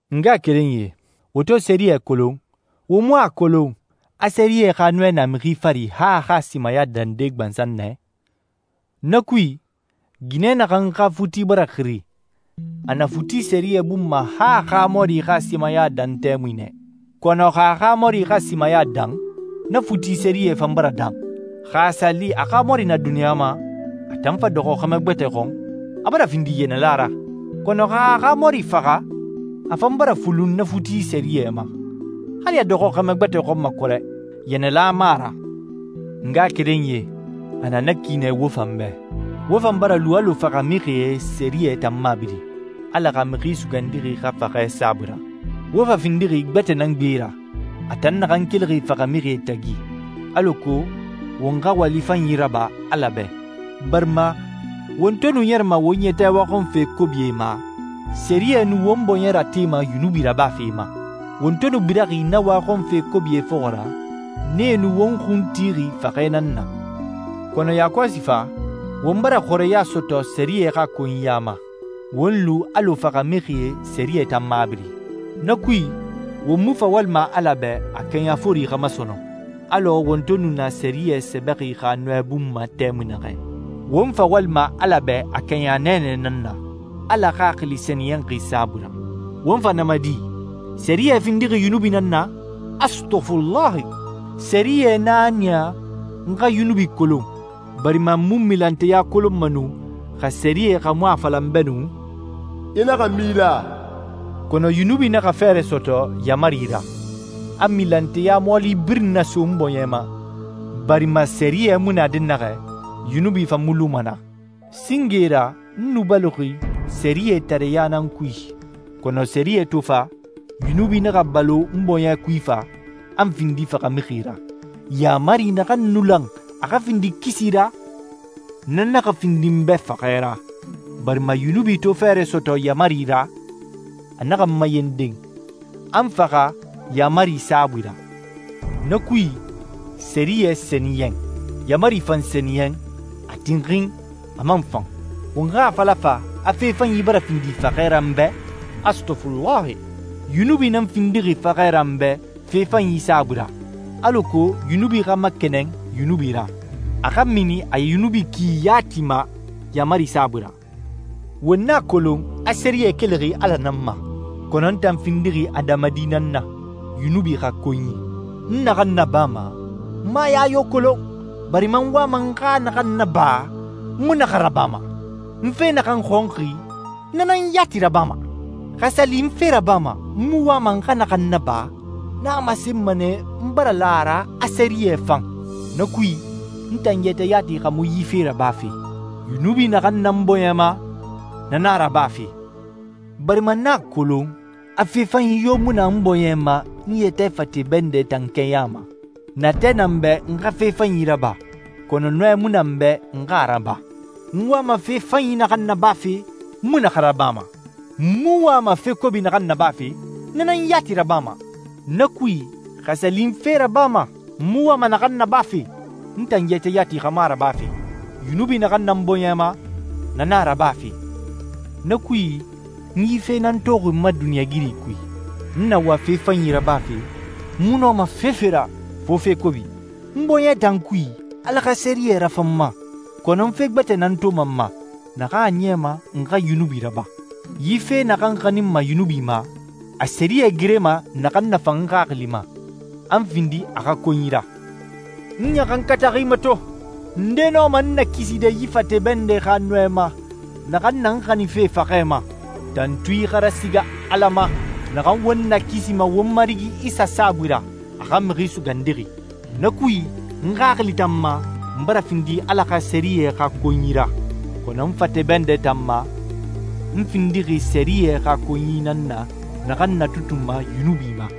N ngaxakerenyie, wo to sɛriyɛ kolon, wo mu a kolon a sɛriyɛ xa nɔɛ na mixi fari han a xa simaya dande gbansan nɛ? Na kui, ginɛ naxan xa futi bara xiri, a na futi sɛriyɛ bun ma han a xa mɔri xa simaya dan tɛmui nɛ. Kɔnɔ xa a xa mɔri xa simaya dan, na futi sɛriyɛ fan bara dan. Xa a sa li a xa mɔri na duniɲa ma, a tan fa dɔxɔ xɛmɛ gbɛtɛ xɔn, a bara findi yɛnɛla ra. Kɔnɔ xa a xa mɔri faxa, a fan bara fulun na futi sɛriyɛ ma. Hali a dɔxɔ xɛmɛ gbɛtɛ xɔn ma kɔrɛ, yɛnɛla mu a ra. N ngaxakerenyie, a na na ki nɛ wo fan bɛ. Wo fan bara lu alɔ faxamixie sɛriyɛ tan mabiri, Ala xa Mixi Sugandixi xa faxɛ saabui ra. Wo fa findixi gbɛtɛ nan gbe ra, a tan naxan kelixi faxamixie tagi, alako won xa wali fanyi raba Ala bɛ. Barima, won to nu ɲɛrɛma won yɛtɛ waxɔnfe kobie ma, sɛriyɛ nu won bɔɲɛ ratema yunubi rabafe ma. Won to nu biraxi na waxɔnfe kobie fɔxɔ ra, nee nu won xun tixi faxɛ nan na. Kɔnɔ yakɔsi fa, won bara xɔrɛya sɔtɔ sɛriyɛ xa konyiya ma, won lu alɔ faxamixie sɛriyɛ tan mabiri. Na kui, won mu fa walima Ala bɛ a kɛɲa fori xa ma sɔnɔn, alɔ won to nu na sɛriyɛ sɛbɛxi xa nɔɛ bun ma tɛmui naxɛ. Won fa walima Ala bɛ a kɛɲa nɛɛnɛ nan na, Ala Xaxili Sɛniyɛnxi saabui ra. Won fa na ma di? Sɛriyɛ findixi yunubi nan na? Astɔfulahi! Sɛriyɛ nan a niya n xa yunubi kolon, barima n mu milanteya kolonma nu xa sɛriyɛ xa mu a fala n bɛ nu, «I naxa mila.» Kɔnɔ yunubi naxa fɛɛrɛ sɔtɔ yaamari ra, a milanteya mɔɔli birin naso n bɔɲɛ ma, barima sɛriyɛ mu na dɛnnaxɛ, yunubi fan mu luma naa. Singe ra n nu baloxi sɛriyɛtareya nan kui, kɔnɔ sɛriyɛ to fa, yunubi naxa balo n bɔɲɛ kui fa, a n findi faxamixi ra. Yaamari naxan nu lan a xa findi kisi ra, na naxa findi n bɛ faxɛ ra, barima yunubi to fɛɛrɛ sɔtɔ yaamari ra, a naxa n mayenden, a n faxa yaamari saabui ra. Na kui, sɛriyɛ sɛniyɛn, yaamari fan sɛniyɛn, a tinxin, a man fan. Won xa a fala fa, a fe fanyi bara findi faxɛ ra n bɛ? Astɔfulahi! Yunubi nan findixi faxɛ ra n bɛ fe fanyi saabui ra, alako yunubi xa makɛnɛn yunubi ra, a xa mini a yunubi ki yati ma yaamari saabui ra. Won a kolon a sɛriyɛ kelixi Ala nan ma, kɔnɔ n tan findixi adamadi nan na, yunubi xa konyi. N naxan nabama, n mu a ya yo kolon, barima n wama n xa naxan naba, n mu na xa rabama. N fe naxan xɔnxi, n na nan yati rabama. Xa a sa li n fe rabama n mu wama n xa naxan naba, na a masenma nɛ a n bara la a ra a sɛriyɛ fan. Na kui, n tan yɛtɛ yati xa mu yi fe rabafe. Yunubi naxan na n bɔɲɛ ma, na nan a rabafe, barima n a kolon, a fe fanyi yo mu na n bɔɲɛ ma n yɛtɛ fate bɛndɛ tan kɛɲa ma. Natɛ na n bɛ n xa fe fanyi raba, kɔnɔ nɔɛ mu na n bɛ n xa a raba. N wama fe fanyi naxan nabafe, n mu na xa rabama. N mu wama fe kobi naxan nabafe, n na nan yati rabama. Na kui, xa a sa li n fe rabama n mu wama naxan nabafe, n tan yɛtɛ yati xa mu a rabafe. Yunubi naxan na n bɔɲɛ ma, na nan na a rabafe. Na kui, n yi fe nan toxi n ma duniɲɛigiri kui: N na wa fe fanyi rabafe, n mu nɔma fefe ra fo fe kobi. N bɔɲɛ tan kui, Ala xa sɛriyɛ rafan n ma, kɔnɔ n fe gbɛtɛ nan toma n ma, naxan a niyama n xa yunubi raba. Yi fe naxan n xaninma yunubi ma, a sɛriyɛ gerema naxan nafan n xaxili ma, a n findi a xa konyi ra. N ɲaxankataxi mato! Nde nɔma n nakiside yi fate bɛndɛ xa nɔɛ ma naxan na n xaninfe faxɛ ma? Tantui xa rasiga Ala ma naxan won nakisima won Marigi Isa saabui ra, a xa Mixi Sugandixi! Na kui, n xaxili tan ma, n bara findi Ala xa sɛriyɛ xa konyi ra, kɔnɔ n fate bɛndɛ tan ma, n findixi sɛriyɛ xa konyi nan na naxan n natutunma yunubi ma.